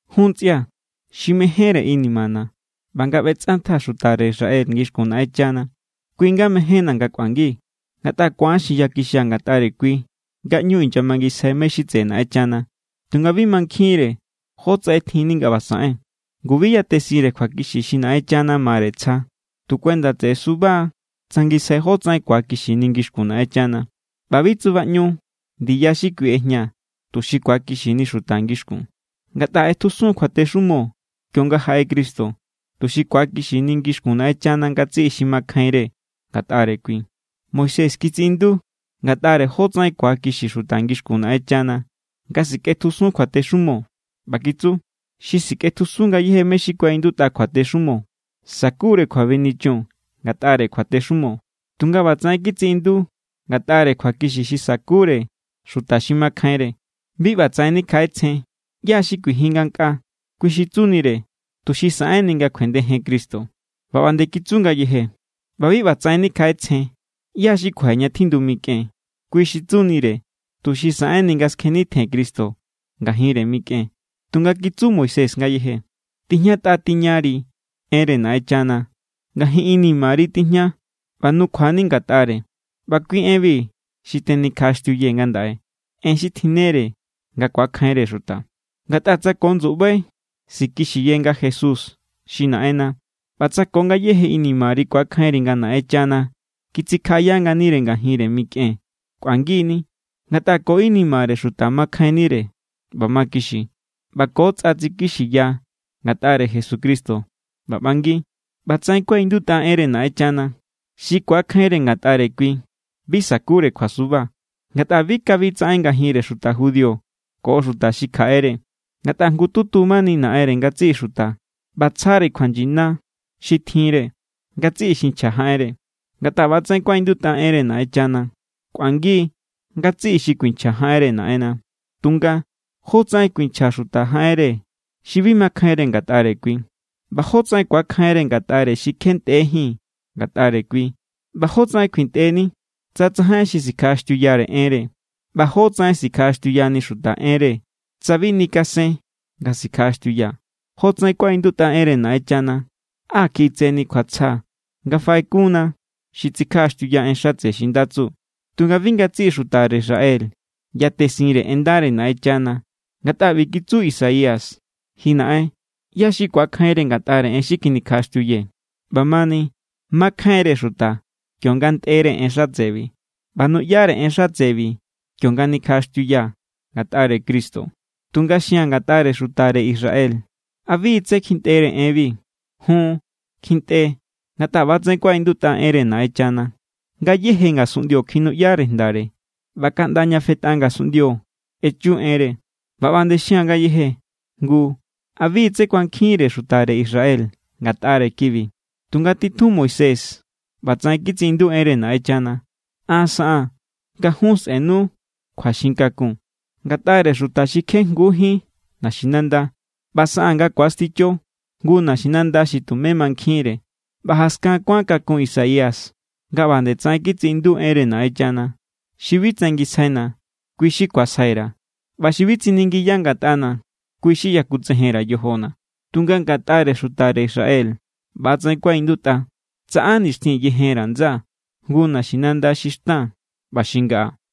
Jun ntsꞌia̱, xi mejénre inimana̱ ꞌba nga ꞌbetsꞌantjaa̱ xutare Israel ngixkun Naꞌenchana, kui= nga mejénna̱ nga kꞌuangi. Ngatꞌa ku̱an xinyakixia̱ ngatꞌare kui nga ꞌñu inyamangisjai mé= xi tseꞌe Naꞌenchana. Tunga bi mankjinre jótsaꞌen tjinni nga ꞌba saꞌen. Ngu bi yatesinre kjuakixi xi Naꞌenchana mare tsja. Tu kuenda tseꞌe suba= tsangisjai jotsaꞌen ku̱akixini ngixkun Naꞌenchana. ꞌBa bi tsubaꞌñu ndiya xi kui ꞌejña tuxi ku̱akixini xuta ngixkun. Ngatꞌa ꞌetjusun= kjuatexumo kionga jaꞌe Cristo, tuxi ku̱akixini ngixkun Naꞌenchana ngatsiꞌi xi makjainre ngatꞌare kui. Moisés kitsiꞌindu ngatꞌare jotsaꞌen ku̱akixi xuta ngixkun Naꞌenchana nga sikꞌetjusun kjuatexumo, ꞌba kitsu: “Xi sikꞌetjusun ngayéje mé= xi kuaꞌindutꞌa kjuatexumo, sa̱kure kjuabenichun ngatꞌare kjuatexumo.” Tunga ꞌbatsaꞌen kitsiꞌindu ngatꞌare kjuakixi xi sa̱kure xuta xi makjainre: “Bi ꞌbatsaꞌen nikjaꞌetsjen: ¿Yá= xi kuijin ngankꞌaa?” Kui xi tsunire tuxi saꞌenni nga kjuendejen Cristo. ꞌBa ꞌba nde kitsu ngayeje: “ꞌBa bi ꞌbatsaꞌen nikjaꞌetsjen: ¿ꞌYá= xi kuaje ña tjindu mikꞌen?” (Kui xi tsunire tuxi saꞌenni nga skjennitjen Cristo ngajinre mikꞌen.) Tunga kitsu Moisés ngayeje: “Tijñatꞌa tiñari enre Naꞌenchana, ngajin inimari tijña ꞌba nukjua=ni ngatꞌare.” ꞌBa kui enbi xi tenikjaꞌaxtiuyee̱ ngandaꞌe, en xi tjinnere nga ku̱akjainre xuta. Ngatꞌa tsa ko ndsuꞌbai sikixiye nga Jesús= xi Naꞌenna, ꞌba tsa ko ngayéje inimari ku̱akjainri nga Naꞌenchana kitsikjaꞌaya nganire ngajinre mikꞌen, kꞌuangi=ni. Ngatꞌa ko inimare xuta makjainnire ꞌba makixi. ꞌBa ko tsꞌa tsikixiya ngatꞌare Jesucristo ꞌba ꞌbangi. ꞌBatsaꞌen kuaꞌindutꞌa enre Naꞌenchana: “Xi ku̱akjainre ngatꞌare kui, bi sa̱kure kjuasuba.” Ngatꞌa bi kabi tsaꞌen ngajinre xuta judío ko xuta xi kjaꞌere. Ngatꞌa jngututu mani Naꞌenre ngatsiꞌi xuta ꞌba tsjare kjuanyina xi tjinre ngatsiꞌi xi nchja jaꞌenre. Ngatꞌa ꞌbatsaꞌen kuaꞌindutꞌa enre Naꞌenchana: “Kꞌuangi= ngatsiꞌi xi kuinchja jaꞌenre Naꞌenna.” Tunga, ¿jótsaꞌen kuinchja xuta jaꞌenre xi bi makjainre ngatꞌare kui? ¿ꞌBa jótsaꞌen ku̱akjainre ngatꞌare xi kje ntꞌejín ngatꞌare kui? ¿ꞌBa jótsaꞌen kjuintꞌeni tsa tsajain xi sikjaꞌaxtiuyare enre? ¿ꞌBa jótsaꞌen sikjaꞌaxtiuyani xuta enre tsa bi nikasen nga sikjaꞌaxtiuya? Jotsaꞌen kuaꞌindutꞌa enre Naꞌenchana: “Á kjiꞌi tse ni kjuatsja nga faꞌekunna xi tsikjaꞌaxtiuya en xatse xi nda tsu.” Tunga bi ngatsiꞌi xutare Israel yatesinre en ndare Naꞌenchana. Ngatꞌa ꞌbi kitsu Isaías: “Ji Naꞌen, ¿ꞌyá= xi kuakjainre ngatꞌare en xi kjinikjaꞌaxtiuyee̱?” ꞌBamani makjainre xuta kionga ntꞌere en xatsebi. ꞌBa nuꞌyare en xatsebi kionga nikjaꞌaxtiuya ngatꞌare Cristo. Tunga xia̱n ngatꞌare xutare Israel: ¿A bi= tsé kjintꞌere enbi? Jun, kjintꞌe=. Ngatꞌa ꞌba=tsaꞌen kuaꞌindutꞌa enre Naꞌenchana: Ngayéje ngasunꞌndio kjinuꞌyare jndare, ꞌba kaꞌnda ña fetꞌa ngasunꞌndio echu enre. ꞌBa ꞌba nde xia̱n ngayeje: Ngu ¿a bi= tsé kuankjinre xutare Israel ngatꞌare kibi? Tunga titjun Moisés ꞌbatsaꞌen kitsiꞌindu enre Naꞌenchana: An saꞌaa̱n nga jun sꞌenu kjuaxin kakun ngatꞌare xuta xi kje jngujín naxinanda, ꞌba saꞌaa̱n nga ku̱asticho jngu naxinanda xi tumé mankjinre. ꞌBa jaskan kuan kakun Isaías nga ꞌba nde tsaꞌen kitsiꞌindu enre Naꞌenchana: Xi bi tsangisjaina̱, kui= xi kuasjai_ra̱. ꞌBa xi bi tsiningiya ngatꞌana̱, kui= xi yakutsejen_ra̱ yojona̱. Tunga ngatꞌare xutare Israel ꞌbatsaꞌen kuaꞌindutꞌa: “Tsaꞌa nixtjin yejen_ra̱ ndsaa̱ jngu naxinanda xi xtan ꞌba xi ngaꞌa.”